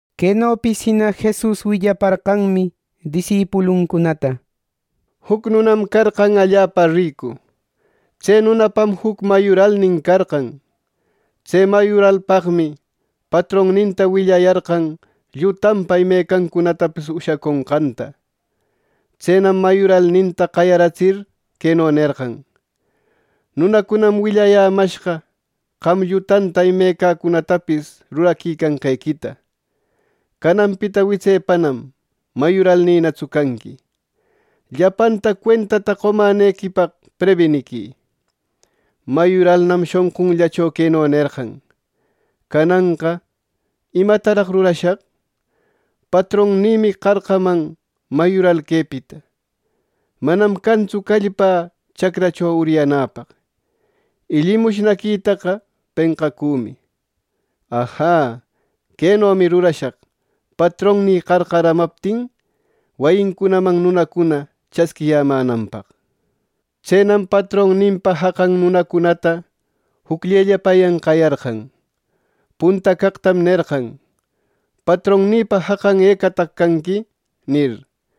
Quenopis jina Jesus willaparqanmi disipuluncunata, “Juc nunam carqan allapa ricu. Tse nunapam juc mayuralnin carqan. Tse mayuralpaqmi patronninta willayarqan llutanpa imecancunatapis ushaconqanta. Tsenam mayuralninta qayaratsir queno nerqan: ‘Nunacunam willayämashqa qam llutanta imecacunatapis ruraconqequita. Cananpita witsepanam mayuralnïnatsu canqui. Llapanta cuentata qomänequipaq prebiniquï.’ Mayuralnam shonqunllacho queno nerqan: ‘Cananqa ¿imataraq rurashaq? Patronnïmi qarqaman mayural quepita. Manam cantsu callpä chacracho uryanäpaq, y llimushnaquitaqa penqacümi. ¡Ajä! ¡Quenomi rurashaq patronnï qarqaramaptin, wayincunaman nunacuna chasquiyämänanpaq!’ Tsenam patronninpa jaqan nunacunata jucllellapayan qayarqan. Punta caqtam nerqan: ‘Patronnïpa jaqan, ¿ecataq canqui?’ nir.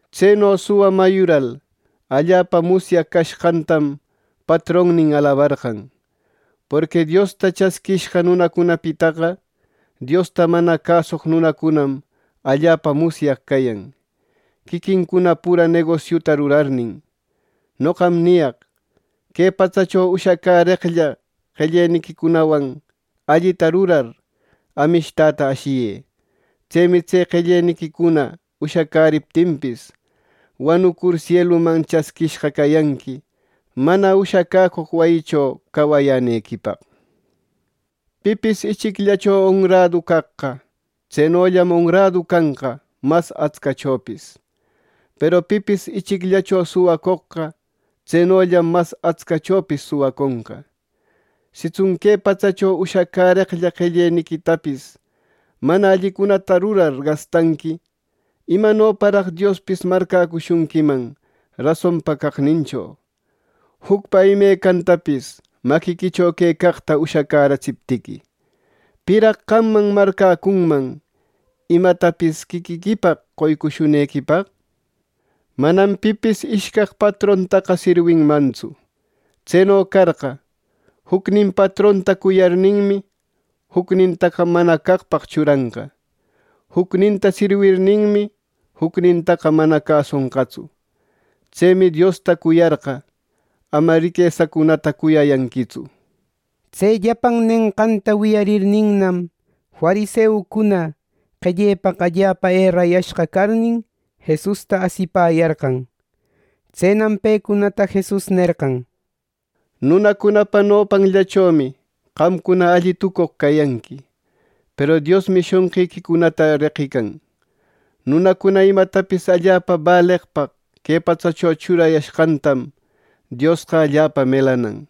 Tseno suwa mayural allapa musyaq cashqantam patronnin alabarqan. Porqui Diosta chasquishqa nunacunapitaqa, Diosta mana cäsoq nunacunam allapa musyaq cayan, quiquincuna pura negosiuta rurarnin. “Noqam niyaq: Que patsacho ushacäreqlla qelleniquicunawan allita rurar, amishtata ashiyë. Tsemi tse qelleniquicuna ushacäriptinpis, wanucur sieluman chasquishqa cayanqui mana ushacäcoq wayicho cawayänequipaq. “Pipis ichicllacho onradu caqqa, tsenollam onradu canqa mas atscachopis; peru pipis ichicllacho suwacoqqa, tsenollam mas atscachopis suwaconqa. Sitsun que patsacho ushacäreqlla qelleniquitapis mana allicunata rurar gastanqui, ¿imanoparaq Diospis marcäcushunquiman rasonpa caqnincho? Jucpa imecantapis maquiquicho quecaqta ushacäratsiptiqui, ¿piraq qamman marcäcunman imatapis quiquiquipaq qoycushunequipaq? “Manam pipis ishcaq patrontaqa sirwinmantsu. Tseno carqa, jucnin patronta cuyarninmi, jucnintaqa mana caqpaq churanqa; jucninta sirwirninmi, jucnintaqa mana cäsonqatsu. Tsemi Diosta cuyarqa, ama riquesacunata cuyayanquitsu.” Tse llapan nenqanta wiyarninnam, fariseucuna qellepaq allapa erayashqa carnin, Jesusta asipäyarqan. Tsenam pecunata Jesus nerqan, “Nunacunapa nopancunallachomi qamcuna alli tucoq cayanqui, peru Diosmi shonqiquicunata reqïcan. Nunacuna imatapis allapa baleqpaq que patsacho churayanqantam, Diosqa allapa melanan.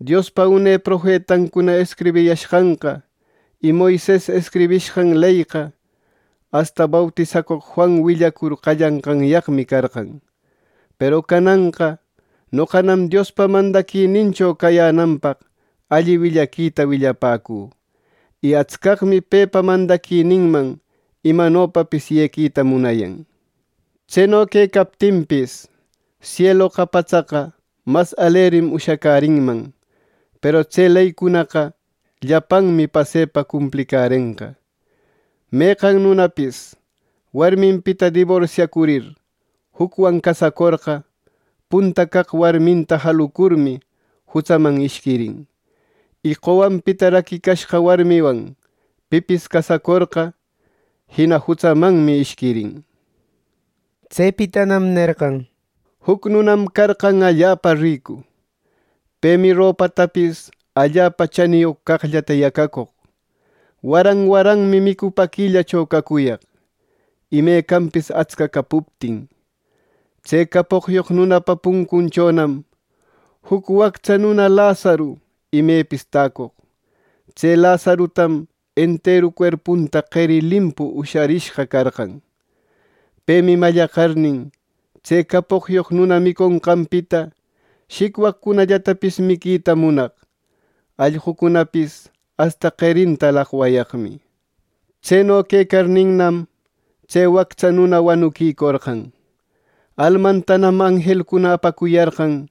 “Diospa une profetancuna escribiyashqanqa y Moises escribishqan leyqa, asta bautisacoq Juan willacur qallanqanyaqmi, carqan. Peru cananqa noqanam Diospa mandaquinincho cayänanpaq alli willaquita willapäcü, y atscaqmi pepa mandaquininman imanopapis yequita munayan. “Tseno quecaptinpis, sieloqa, patsaqa mas alerim ushacärinman, peru tse leycunaqa llapanmi pasepa cumplirenqa. “Meqan nunapis warminpita diborsiacurir jucwan casacorqa, punta caq warminta jalucurmi jutsaman ishquirin; y qowanpita raquicashqa warmiwan pipis casacorqa, jina jutsamanmi ishquirin.” Tsepitanam nerqan, “Juc nunam carqan allapa ricu. Pemi ropatapis allapa chaniyoq caqllata yacacoq. Waran waranmi micupäquillacho cacuyaq, imecanpis atsca capuptin. Tse capoqyoq nunapa puncunchonam juc wactsa nuna Lazaro imepis täcoq. Tse Lazarotam enteru cuerpunta qeri limpu usharishqa carqan. Pemi mallaqarnin, tse capoqyoq nuna miconqanpita shicwapicunallatapis miquita munaq. Allqucunapis asta qerinta laqwayaqmi. Tseno quecarninnam, tse wactsa nuna wanuquicorqan. Almantanam anjelcuna apacuyarqan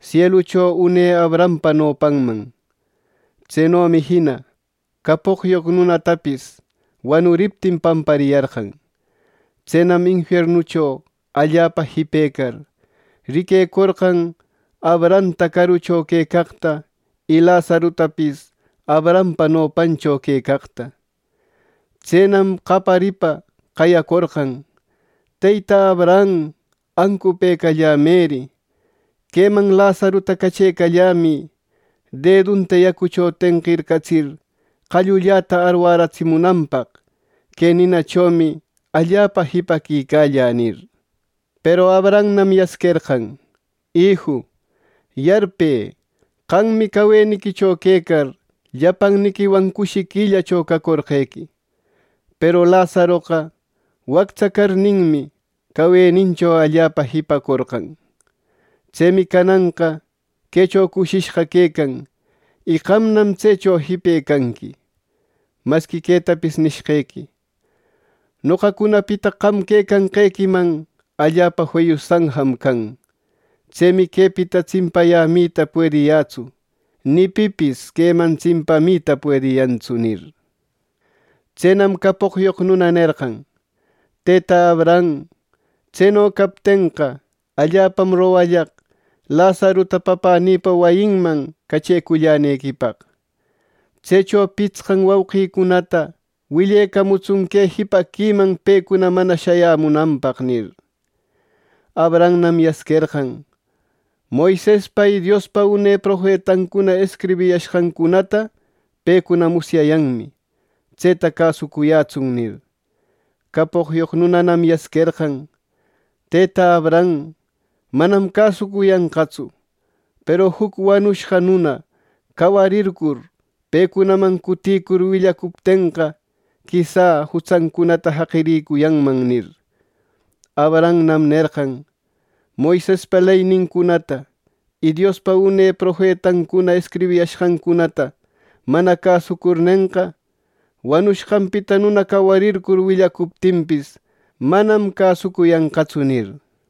sielucho une Abrahampa nopanman. Tsenomi jina capoqyoq nunatapis wanuriptin, pampariyarqan. “Tsenam infiernucho allapa jipecar, riquecorqan Abrahamta carucho quecaqta, y Lazarotapis Abrahampa nopancho quecaqta. Tsenam qayaripa qayacorqan, ‘Tetä Abraham, ¡ancupëcallämëri! Queman Lazarota cachecallämï, dedunta yacucho tenqircatsir, qallulläta arwäratsimunanpaq. Que ninachomi allapa jipaquicällä’ nir. Peru Abrahamnam yasquerqan, ‘Iju, yarpë qammi caweniquicho quecar, llapanniquiwan cushiquillacho cacorqequi; peru Lazaroqa wactsa carninmi, cawenincho allapa jipacorqan. Tsemi cananqa quecho cushishqa quecan, y qamnam tsecho jipecanqui. Masqui quetapis nishqequi: Noqacunapita qam quecanqequiman allapa feyu sanjam can. Tsemi quepita tsimpayämita puediyätsu. Ni pipis queman tsimpamita puediyantsu’ nir. “Tsenam capoqyoq nuna nerqan, ‘Tetä Abraham, tseno captenqa, allapam rogallaq Lazarota papänïpa wayinman cachecullänequipaq. Tsecho pitsqan wauqïcunata willecamutsun que jipaquiman pecuna mana shayämunanpaq’ nir. Abrahamnam yasquerqan: ‘Moisespa y Diospa une profetancuna escribishqancunata pecuna musyayanmi. Tseta cäsucuyätsun’ nir. Capoqyoq nunanam yasquerqan: ‘Tëta Abraham, manam cäsucuyanqatsu; peru juc wanushqa nuna cawarircur, pecunaman cutïcur willacuptenqa, quisa jutsancunata jaqirïcuyanman’ nir. Abrahamnam nerqan. ‘Moisespa leynincunata y Diospa une profetancuna escribiyashqancunata mana cäsucurnenqa, wanushqanpita nuna cawarircur willacuptinpis, manam cäsucuyanqatsu’ nir.”